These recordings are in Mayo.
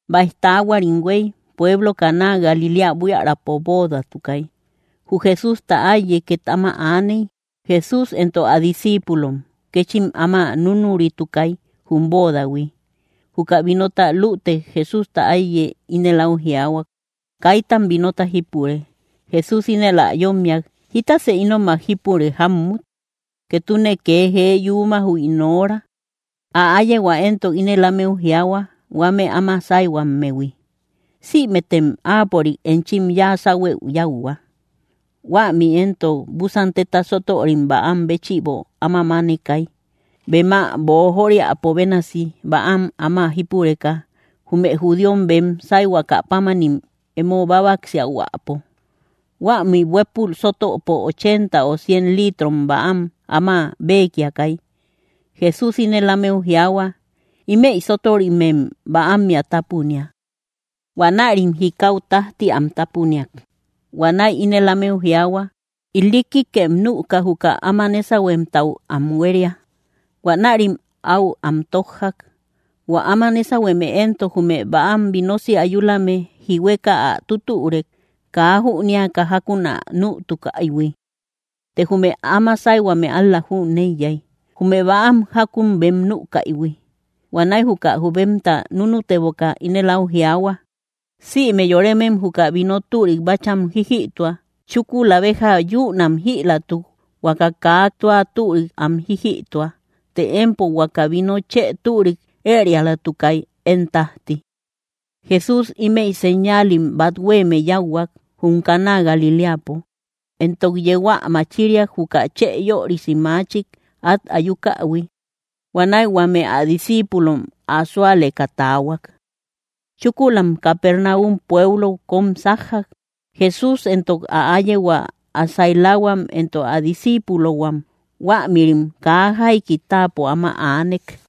Báij taahuarim huéy, pueblo Caná Galiléa buiärapo boodatukay. Jü Jesústa áiye két áma aaney. Jesús éntok ä discíipulom, kéchim áman núnuritukay, jum boodahui. Juka vinota lütek, Jesústa áiye ínel áu jiaahuak: —Kaitam vinota jípure. Jesús ínel ä yómmiak: —¿Jítasë ínomak jípure jámmut? Ketune kee jee yuuma, jü ín hora. Ä áyehua éntok ínel ámeu jiaahua, huame áma sáyhuammehui: —Sïmetem áapörik enchim yáa sáhuëu yáuhua. Huämi éntok búsan téta sótörim bäam béchïbo áma mánekay, bem ä boojoriapo bénasi, bäam áma jípureka, jume judíom bem sáyhuakä pámani emo bábaksiahuäpo. Huämi huépul sótöpo ochenta o cien litrom bäam áma bekiakay. Jesús ínel ámeu jiaahua: —Ímëi sótörimem bäammea tápunia. Huanärim jikau tájti am tápuniak. Huanäi ínel ámeu jiaahua: —Ilikkikem nüka, jü áma nésahuemtau am huéria. Huanärim áu am tójjak. Huä áma nésahueme éntok, jume bäam vinosi ayulame jihueka ä tútürek, kaa jünéaka jákun ä nütukaïhui. Të jume áma sáyhuame ál‑la jüneiyay, jume bäam jákun bem nükaihui. Huanäi juka jubemta núnuteboka, ínel áu jiaahua: —Sïme yoremem juka vino türik bácham jíjïtua; chúkula béja yünam jïlatuk, huaka kaa tua türik am jíjïtua. Të empo huaka vino chë türik ërialatukay, én tájti. Jesús ímëi señaalim bát huéeme yáuhuak, jum Caná Galiléapo, éntok yeu ä machiriak juka chë yörisi machik át ayukähui. Huanäi huame ä discíipulom ä súaleka taahuak. Chúkulam Capernaum pueblou kóm sájjak, Jesús éntok ä áyehua, ä sailahuam, éntok ä disciipulohuam. Huämïrim kaa jaiki táapo áma aanek.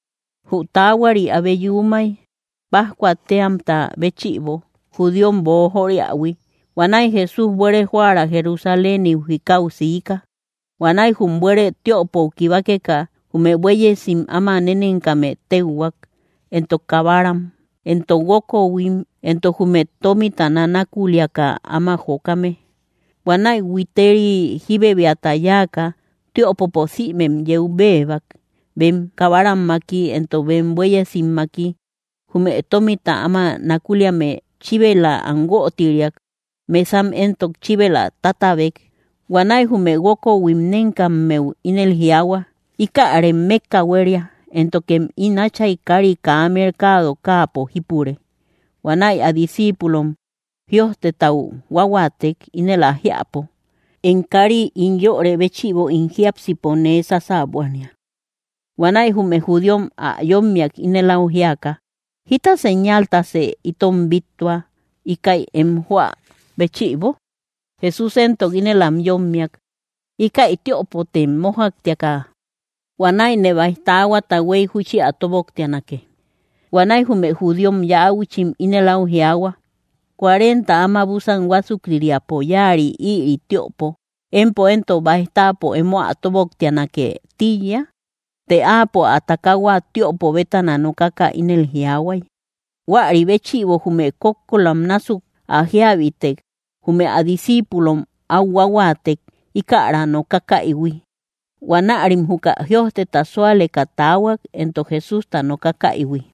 Jü taahuari abe yuumay, pájcua téamta béchïbo, judíom boojoriähui. Huanäi Jesús buere joära Jerusaléniu jikau siika. Huanäi jum buere tiöpou kibakeka, jume buéyesim áma nénenkame téuhuak, éntok kabaram, éntok guókohuim, éntok jume tómita nanakuliaka áma jokame. Huanäi huiteri jíbebiata yáaka, tiöpopo sïmem yeu béebak, bem kabarammaki, éntok bem buéyesimmaki. Jume tómita áma nakuliame chíbela am guötiriak; mesam éntok chíbela tátabek. Huanäi jume guókohuim nénkammeu ínel jiaahua: —¡Íkärem mékka huéria, éntokem ín Áchay kári kaa mercado káapo jípure! Huanäi ä discíipulom jïojtetau huáhuaatek, ínel ä jiäpo: “Em káari ín yörë béchïbo ín jiápsipo nee sasäbuania.” Huanäi jume judíom ä yómmiak ínel áu jiaka: —¿Jíta señaltasë itom bíttua, íkäi em joä béchïbo? Jesús éntok ínel am yómmiak: —Íkäi tiöpotem mójaktia; huanäine báij taahuata huéy júchi ä tóboktianake. Huanäi jume judíom yauchim ínel áu jiaahua: —Cuarenta áma búsan huásuktiriapo yáari ïri tiöpo; ¿empo éntok báij táapo emo ä tóboktianake tíiya? Të áapo ä takaahua tiöpo bétana nokaka ínel jiaahuay. Huäri béchïbo jume kókkolam násuk ä jíabitek, jume ä discíipulom áu huáhuaatek, íkära nokakaïhui. Huanärim juka jïojteta súaleka taahuak, éntok Jesústa nokakaïhui.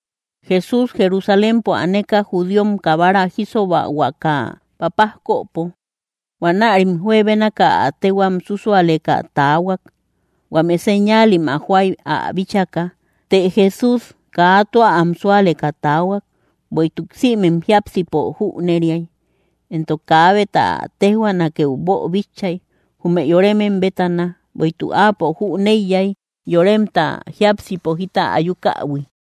Jesús Jerusalémpo aneka, judíom kabara jísobahuakä papajköpo. Huanärim juebénaka ä téhuam súsualeka taahuak, huame señaalim ä joay ä bíchaka. Të Jesús kaa tua am súaleka taahuak, bueïtuk sïmem jiápsipo jüneriay, éntok kaabeta ä téjhuaanakeu boobíchaïhuiy, jume yoremem bétana; bueïtuk áapo jüneiyay yoremta jiápsipo jita ayukähui.